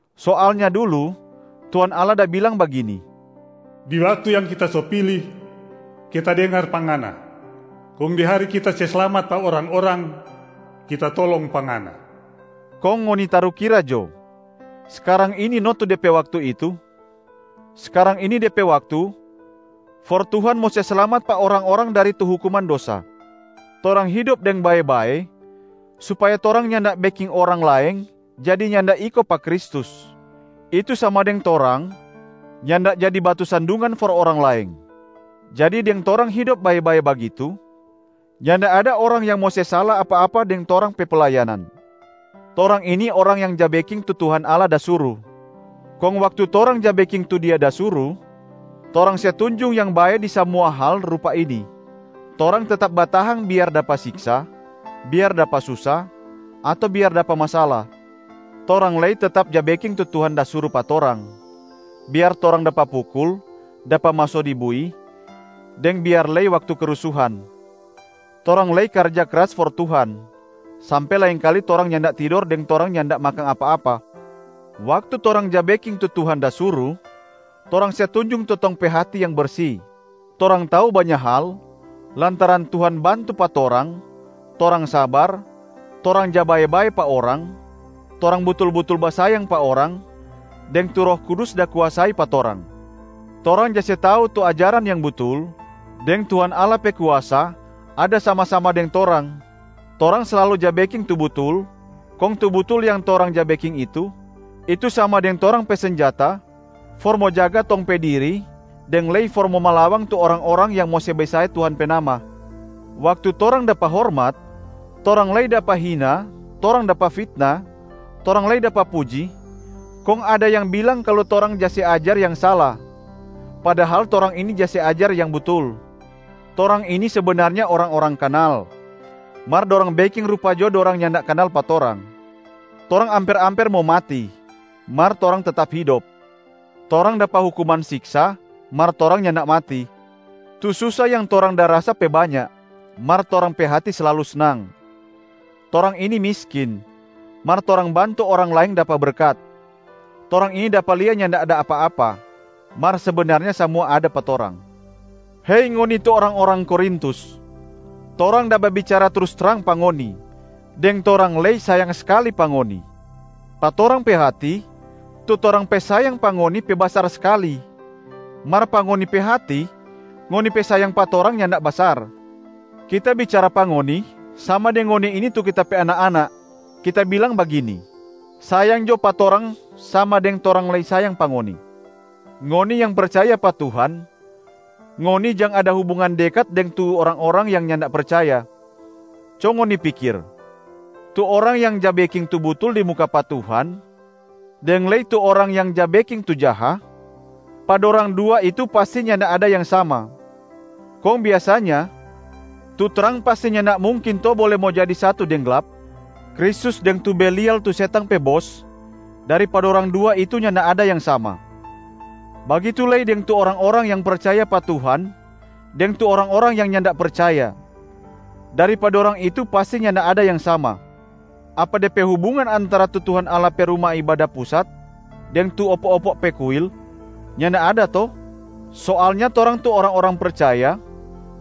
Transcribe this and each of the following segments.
Soalnya dulu Tuhan Allah da bilang bagini, “Di waktu yang Kita so pili, Kita dengar pa ngana, kong di hari Kita se slamat pa orang-orang, Kita tolong pa ngana.” Kong ngoni tarukira jo, skarang ini no tu de pe waktu itu. Skarang ini de pe waktu for Tuhan mo se slamat pa orang-orang dari tu hukuman dosa. Torang hidop deng bae-bae supaya torang nyanda beking orang laeng jadi nyanda iko pa Kristus, itu sama deng torang nyanda jadi batu sandungan for orang laeng. Jadi deng torang hidop bae-bae bagitu, nyanda ada orang yang mo se sala apa-apa deng torang pe playanan. Torang ini orang yang ja beking tu Tuhan Allah da suru, kong waktu torang ja beking tu Dia da suru, torang se tunjung yang bae di samua hal rupa ini: torang tetap batahang biar dapa siksa, biar dapa susa, ato biar dapa masala. Torang lei tetap ja beking tu Tuhan da suru pa torang, biar torang dapa pukul, dapa maso di bui, deng biar lei waktu kerusuhan. Torang lei karja kras for Tuhan, sampe laengkali torang nyanda tidor deng torang nyanda makang apa-apa. Waktu torang ja beking tu Tuhan da suru, torang se tunjung tu tong pe hati yang bersi, torang tau banya hal lantaran Tuhan bantu pa torang, torang sabar, torang ja babae-bae pa orang, torang butul-butul basayang pa orang, deng tu Roh Kudus da kuasai pa torang. Torang ja se tau tu ajaran yang butul deng Tuhan Allah pe kuasa ada sama-sama deng torang. Torang slalu ja beking tu butul, kong tu butul yang torang ja beking itu, itu sama deng torang pe senjata for mo jaga tong pe diri deng lei for mo malawang tu orang-orang yang mo se besae Tuhan pe nama. Waktu torang dapa hormat, torang lei dapa hina, torang dapa fitna, torang lei dapa puji, kong ada yang bilang kalu torang ja se ajar yang sala, padahal torang ini ja se ajar yang butul. Torang ini sebenarnya orang-orang kanal, mar dorang beking rupa jo dorang nyanda kanal pa torang. Torang amper-amper mo mati, mar torang tetap hidop. Torang dapa hukuman siksa, mar torang nyanda mati. Tu susa yang torang da rasa pe banya, mar torang pe hati slalu snang. Torang ini miskin, mar torang bantu orang laeng dapa berkat. Torang ini dapa lia nyanda ada apa-apa, mar sebenarnya samua ada pa torang. Hei ngoni tu orang-orang Korintus, torang da babicara trus trang pa ngoni, deng torang lei sayang skali pa ngoni. Pa torang pe hati, tu torang pe sayang pa ngoni pe basar skali, mar pa ngoni pe hati, ngoni pe sayang pa torang nyanda basar. Kita bicara pa ngoni sama deng ngoni ini tu kita pe anak-anak, kita bilang bagini: sayang jo pa torang sama deng torang lei sayang pa ngoni. Ngoni yang percaya pa Tuhan, ngoni jang ada hubungan dekat deng tu orang-orang yang nyanda percaya. Co ngoni pikir, tu orang yang ja beking tu butul di muka pa Tuhan deng lei tu orang yang ja beking tu jaha, pa dorang dua itu pasti nyanda ada yang sama. Kong biasanya, tu trang pasti nyanda mungkin to bole mo jadi satu deng glap? Kristus deng tu Belial tu setang pe bos, dari pa dorang dua itu nyanda ada yang sama. Bagitu lei deng tu orang-orang yang percaya pa Tuhan deng tu orang-orang yang nyanda percaya, dari pa dorang itu pasti nyanda ada yang sama. Apa de pe hubungan antara tu Tuhan Allah pe Ruma Ibada Pusat deng tu opo-opo pe kuil? Nyanda ada to? Soalnya torang tu orang-orang percaya,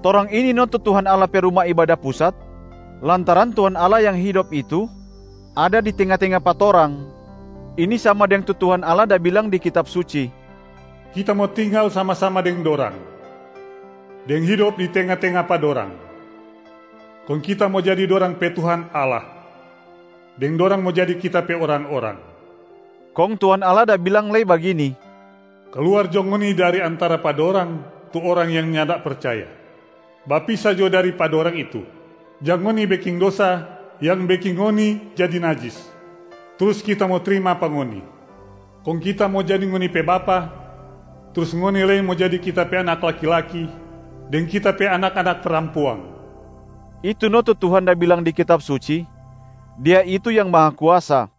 torang ini no tu Tuhan Allah pe Ruma Ibada Pusat, lantaran Tuhan Allah yang hidop itu ada di tenga-tenga pa torang. Ini sama deng tu Tuhan Allah da bilang di Kitab Suci, “Kita mo tinggal sama-sama deng dorang, deng hidop di tenga-tenga pa dorang, kong Kita mo jadi dorang pe Tuhan Allah, deng dorang mo jadi Kita pe orang-orang.” Kong Tuhan Allah da bilang lei bagini, “Kaluar jo ngoni dari antara pa dorang tu orang yang nyanda percaya, bapisa jo dari pa dorang itu. Jang ngoni beking dosa yang beking ngoni jadi najis, trus Kita mo trima pa ngoni. Kong Kita mo jadi ngoni pe Bapa, trus ngoni lei mo jadi Kita pe anak laki-laki deng Kita pe anak-anak parampuang.” Itu no tu Tuhan da bilang di Kitab Suci, Dia itu yang Mahakuasa.